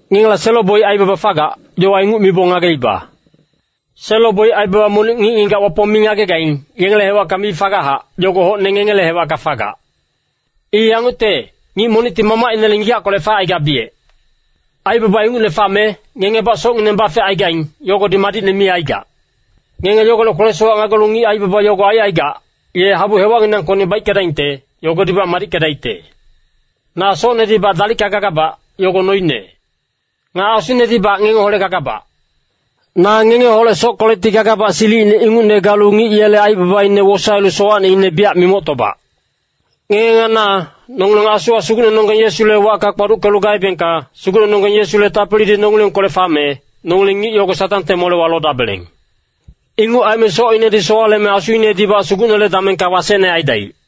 Ngengela selo-boic aibaba fagac, yowa inguc mibong ngageiba. Selo-boic aibaba monic ngic-ngigac Wapong mi ngagegaing, yengele hewacka mi fagachac, yogo hocne ngengele hewacka fagac. I yangucte, ngic monicti mamacinele ngigackolec facaigabiyec. Aibaba ingucne fame, ngengebac socngineng bafecaigaing, yogodi madicne mi aigac. Ngenge yogolec kwele-sowac ngagelu ngic aibaba yogo aicaigac, ye habu hewacnginangkocni baickedaingte, yogodibac madickedaicte. Na socnedibac dalicka gagabac, yogo noine. Nga asunedibac ngengeholec gagabac. Na ngengeholec sockolecti gagabac silicine ingucne galu ngic yele aibabaine wosaelu sowacneine biyac mimoctobac. Ngenge nga na, nongileng asuwa Sugucnenonggeng Yesule wacka kpaduckelu gaebengka, Sugucnenonggeng Yesule tapilidi nongilengkolec fame, nongileng ngic yogo Satangte molewa lodabeleng. Inguc aime socinedi sowaleme asuinedibac Sugucnele damengka wasecne aidaic.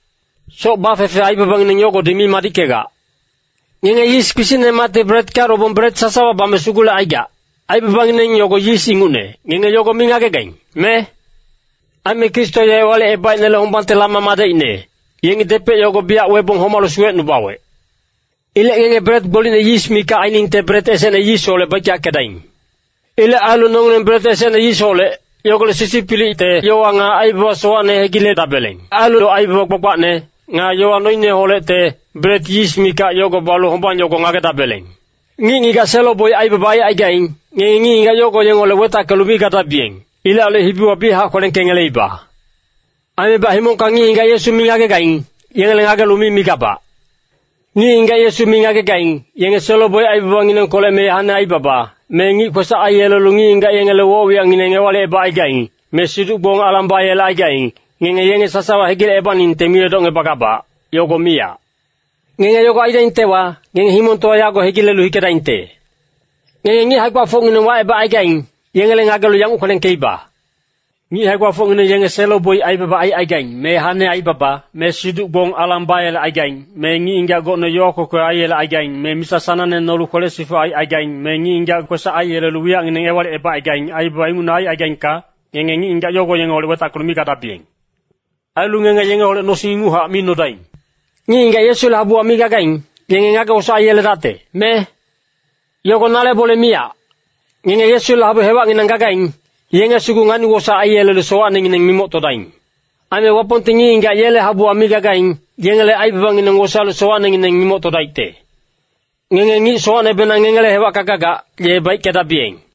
Soc bafefe aibabangineng yogodi mi madickegac. Ngenge yis kpisicnemacti bretka lobong bret sasawa bame sugulecaigac, aibabangineng yogo yis ingucne, ngenge yogo mi ngagegaing, me? Aime Kristo ye Ewalicebaicnele hombangte lama madecine, yengi depec yogo biyac webong homalu suwecnubawec. Ilec ngenge bret gbolicne yis mikac ainingte bret esecne yisholec baickeyackedaing. Ilec ailu nongileng bret esecne yisholec, yogolec sisipilicte yowa nga aibaba sowacne hegiledabeleng. Ailu aibaba gbagbacne, nga yowa noineholecte, bret yis mikac yogo balu hombang yogo ngagedabeleng. Ngic-ngigac selo-boic aibaba aicaigaing, ngenge ngic-ngigac yogo yengeholec wetackelu mi gadabiyeng. Ilec ailu hibiwa biyachac kwelengkengeleiba. Aimebac himongka ngic-ngigac Yesu mi ngagegaing, yengele ngagelu mi migabac. Ngic-ngigac Yesu mi ngagegaing, yenge selo-boic aibabanginengkolec me hane aibaba, me ngic kwesac aiyelelu ngic-ngigac yengele woc-wiyacngineng ewalicebacaigaing. Me siduc-gbong alang bayelecaigaing, ngenge yenge sasawa hegilecebaningte mi edocngebagabac, yogo miyac. Ngenge yogo aidaingtewa, ngenge himongtowa yago hegilelu hikedaingte. Ngenge ngic hae-gbafocngineng wacebacaigaing, yengele ngagelu yanguc kwelengkeiba. Ngic hae-gbafocngineng yenge selo-boic aibaba aicaigaing, me hane aibaba, me siduc-gbong alang bayelecaigaing. Me ngic-ngigac gocne yowa kwekwe aiyelecaigaing, me misa sanangne nolu kwele-sifuc aicaigaing, me ngic-ngigac kwesac aiyelelu wiyacngineng ewalicebacaigaing. Aibaba ingucne aicaigaingka, ngenge ngic-ngigac yogo yengeholec wetackelu mi gadabiyeng. Ailu ngenge yengeholec nosing inguchac mi nodaing. Ngic-ngigac Yesule habuwa mi gagaing, yenge ngage-wosaec aiyeledacte, me? Yogo nale bole miyac. Ngenge Yesule habu hewacnginang gagaing, yenge sugu ngani-wosaec aiyelelu sowacnengineng mimoctodaing. Aime Wapongti ngic-ngigac yele habuwa mi gagaing, yengele aibabangineng wosaelu sowacnengineng mimoctodaicte. “Ngenge ngic sowacnebenang ngengele hewacka gagac, ye baickedabiyeng.”